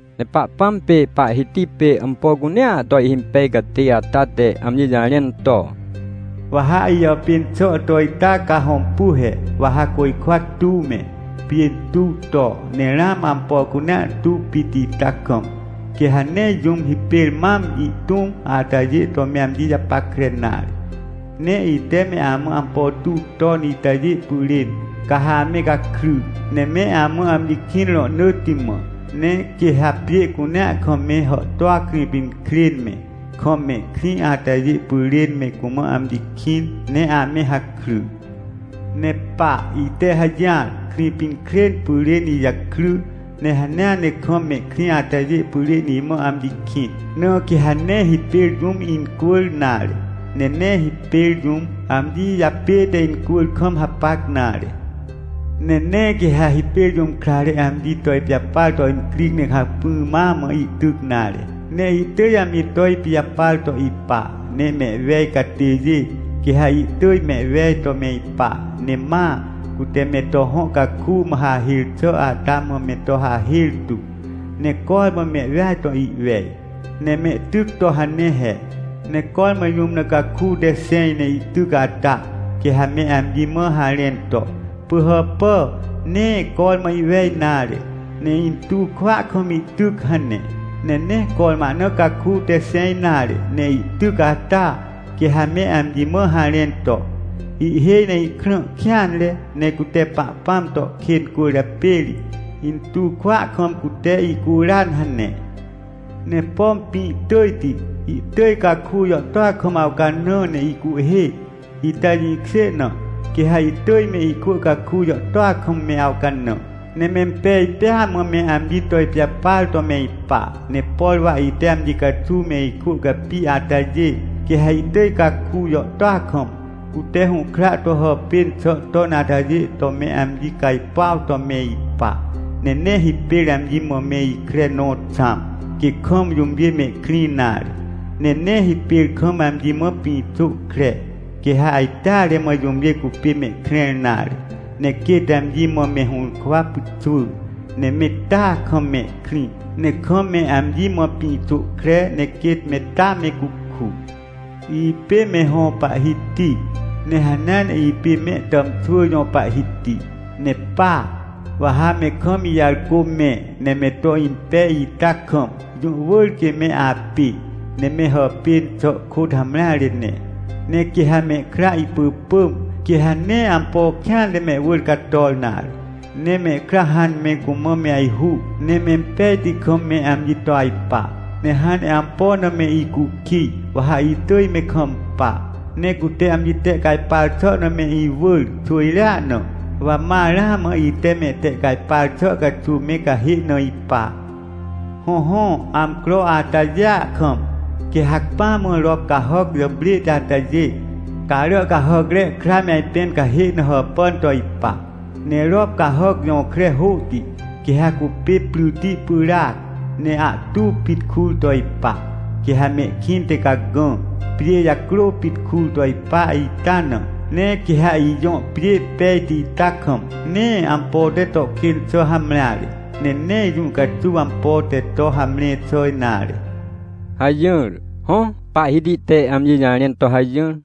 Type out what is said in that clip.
Ne Pahpãm pê Pahhiti pê ampo cunea to ihhimpej catê ata te amji jarẽn to: “Wa ha ijàpên xà to ita ca hõmpu he: Wa ha côjkwa tuw me, pjê tuw to, ne ramã ampo cunea tuw pit ita kam, quê ha nee jũm hipêr mam ihtũm atajê to me amji japackre nare. Ne ite me amã ampo tuw ton itajê pyrên, ca ha ame gakry, ne me amã amji kĩn rohnỳtti mã. Ne quê ha pjê cunea kam me hàhtôa Krĩpinkrên me, kam mehkrĩ atajê pyrên me cumã amji kĩn, ne ame hakry. Ne pa, ite hajỹar, Krĩpinkrên pyrên ijakry, ne hanea ne kam mehkrĩ atajê pyrên imã amji kĩn. Na quê ha nee hipêr jũm incwỳr nare, ne nee hipêr jũm, amji japête incwỳr kam hapac nare. “Ne nee quê ha hipêr jũm krare amji to ipijapar to incri ne hacpỹ ma mã ihtyc nare, ne ihtỳj amji to ipijapar to ipa. Ne mehwej catêjê, quê ha ihtỳj mehwej to me ipa, ne maa, cute me to hõ caku mã hahêr xà ata mã me to hahêr tu, ne cormã mehweaj to ihwej, ne mehtyc to hane he. Ne cormã jũm na caku te xẽj ne ihtyc ata, quê ha me amji mã harẽn to: ‘Pỳhàpà, nee cormã ihwej nare, ne intuw kwỳa kam ihtyc’ hane. Ne nee cormã ahna caku te xẽj nare, ne ihtyc ata, quê ha me amji mã harẽn to: ‘Ihhêj ne ihkrã kêanre, ne cute Pahpãm to kên cwỳrjapê ri, intuw kwỳa kam cute ihcuran’ hane. Ne pom pĩ tỳjti, ihtỳj caku jàhtôa kam awcanã ne ihcuhhê, ita jĩkjê na, quê ha ihtỳj me ikwỳ caku jàhtôa kam me awcanã, ne mempej pêa mã me amji to ipijapar to me ipa. Ne por wa ite amji caxuw me ikwỳ capi atajê, quê ha ihtỳj caku jàhtôa kam, cute hũhkra to hàpên xà ton atajê to me amji cajpuaw to me ipa. Ne nee hipêr amji mã me ikre nõ xãm, quê kam jũmjê mehkrĩ nare. Ne nee hipêr kam amji mã pĩxô kre, quê ha ajteare mã jũmjê cupê mehkrẽr nare. Ne quêt amji mã me hũrkwa pyxwỳ, ne me taa kam mehkrĩ. Ne kam me amji mã pĩxô kre, ne quêt me taa me cuku. “Ipê me hõ Pahhiti, ne hanea ne ipê mehtàmxwỳ jõ Pahhiti. Ne paa, wa ha me kam ijarcô mẽ, ne me to impej ita kam, jũ wỳr quê me apê, ne me hàpên xà kôt hamreare ne. Ne quê ha mehkra ihpỳpỳm, quê ha nee ampo kêanre mehwỳr cator nare. Ne mehkra hãn ne me cumã me ajhu, ne mempejti kam me amji to ajpa. Ne hãn ne ampo na me icukij, wa ha itỳj me kampa. Ne cute amji tehcajpar xà na me iwỳr xwỳjrea na, wa ma ramã ite mehtehcajpar xà caxuw me cahê na ipa. “Hõhõ, amcro atajêa kam, quê hacpỹa mã rop cahàc jàprêhti atajê, carà cahàcre kra me ajpẽn cahê na hàpàn to ipa. Ne rop cahàc jõkre hôhti, quê ha cupê pryti pyràac, ne ahtu pit kur to ipa. Quê ha mehkĩnte cagã, pjê jacrô pit kur to ipa ita na. Ne quê ha ijõ pjê pejti ita kam, nee ampo te to kên xà hamreare, ne nee jũ caxuw ampo te to hamre xà nare” hajỹr. Hõ, Pahhiti te amji jarẽn to hajỹr.